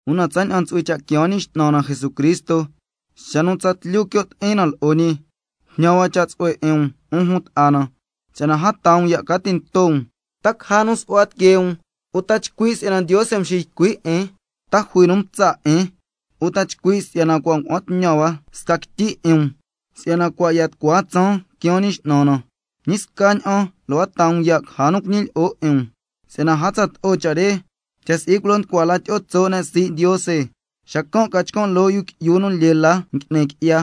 Una tsaña'an ntsu'hui cha' quiaan Ñi X'nan na Jesucristo, xa nu tsatlyu quio' ti'in na lo'o ñi, jñan hua cha' tsu'hue 'in um, 'un jun ta'a na, si'yana a taa um ya' ca tinto um, ta caja nu su'hua tiquee um, uta chcui' si'yana Ndiose mxiycui' 'in, ta jui nu mtsa' 'in, uta chcui' si'yana cua' ngua'an tñan hua sca quityi 'in um, si'yana cua' ya tucua tsaan quiaan Ñi X'nan na. Ñi scaña'an lo' a taa um ya' caja nu cuñilyi'o 'in um, si'yana a tsato'o cha' re cha' si'i culo nducua la tyi'o tso' ne' sii' Ndiose, xa ca chcan' loo yu qui'yu nu lyee la ngui'ni qui'ya,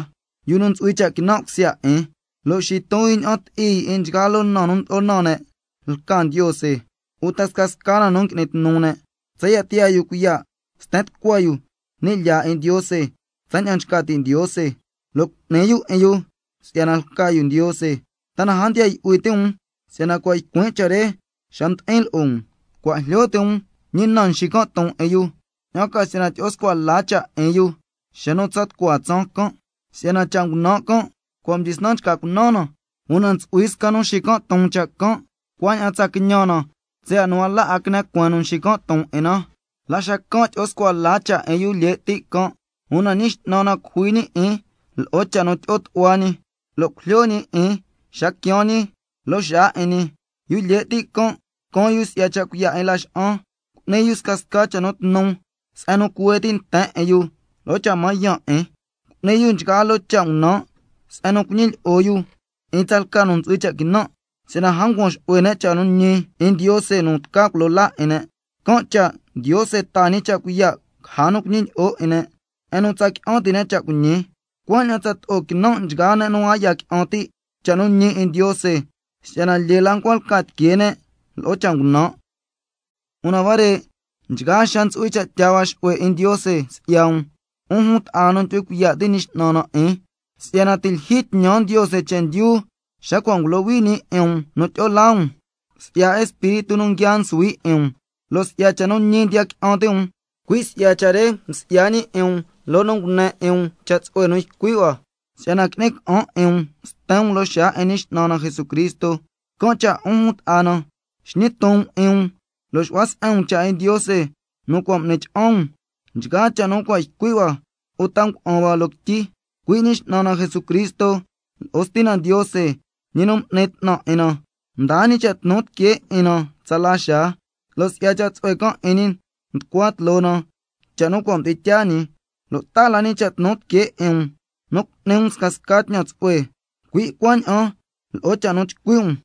yu nu ntsu'hui cha' quinan' cusya 'in. Lo' xiton yu ña'an ti'i yu 'in nchgaa loo na nu ndlo'o naan ne' lca Ndiose, uta scasca na nu ngui'ni tnu ne', tsaya' tiyaa yu cuiya' sten tucua yu ni' lyaa 'in Ndiose tsaña'an nchca ti' Ndiose, lo' cu'ni yu 'in yu si'yana lca yu Ndiose. ¿Ta na a ndiya yu'hui ti' um si'yana cua' ycuin' cha' re xa mdi'in lo'o um? Cua' jlyo ti' um ñi na nxican' ton 'in yu, ña'an ca si'yana tyi'o scua la cha' 'in yu xa nu tsa tucua tsaan can'. Si'yana cha' ngunan' can' cua' mdyisnan nchca cunan na, una ntsu'hui sca nu nxican' ton cha' can', cuaña'an tsa quiñan na tsaya' nu a la 'a quine cueen nu nxican' ton 'in na. La xacan' tyi'o scua la cha' 'in yu lye' ti' can', —una Ñi X'nan na cujui ñi 'in lo'o cha' nu tyi'o tu'hua ñi—, lo' cujlyo ñi 'in xa quiaan ñi loo xaa 'in ñi. Yu lye' ti' can' caan yu si'ya cha' cuiya' 'in laxa'an, cu'ni yu scasca cha' nu tnu se'en nu cuhue ti' nten 'in yu lo'o cha' mañan 'in, cu'ni yu nchgaa loo cha' ngunan' se'en nu cuñilyi'o yu 'in tsalca nu ntsu'hui cha' quinan', si'yana a ncuan xu'hue ne' cha' nu ñi 'in Ndiose nu tca culo laa 'in ne'. Can' cha' Ndiose taa ñi cha' cuiya' caja nu cuñilyi'o 'in ne', se'en nu tsa qui'an ti' ne' cha' cuiñi, cuaña'an tsato'o quinan' nchgaa ne' nu a ya qui'an ti' cha' nu ñi 'in Ndiose, si'yana lyee la ncua lca tiquee ne' lo'o cha' ngunan'. Una huare' nchgaa xaa ntsu'hui cha' tyaa hua xu'hue 'in Ndiose si'ya um, 'un jun ta'a na nu ndyu'hui cuiya' ti' Ñi X'nan na 'in, si'yana ti' lyijyi tñan Ndiose chendyu xa cua' ngulohui ñi 'in um nu tyi'o laa um, si'ya Espíritu nu nguia nsuhui 'in um, lo' si'ya cha' nu ñi ndiya qui'an ti' um. Cui' si'ya cha' re msi'ya ñi 'in um loo nu ngune 'in um cha' tsu'hue nu ycui' hua, si'yana qui'ni ca'an 'in um sten um loo xaa 'in Ñi X'nan na Jesucristo. Can' cha' 'un jun ta'a na, xñi ton um 'in um lo' xu'hua se'en um cha' 'in Ndiose nu cua' m'ni cha'an um, nchgaa cha' nu cua' ycui' hua, uta lo'o cha' nu ngua'an hua loo quityi. Cui' Ñi X'nan na Jesucristo lo'o Stina Ndiose, ñi nu m'ni 'tnan 'in na, mdaa ñi cha' tnu tiquee 'in na tsala xaa, lo' si'ya cha' tsu'hue can' 'in ñi nducua tloo na cha' nu cua' mdi'in tyaa ñi, lo' taa la ñi cha' tnu tiquee 'in um nu cu'ni um scasca tñan tsu'hue, cui' cuaña'an lo'o cha' nu chcui' um.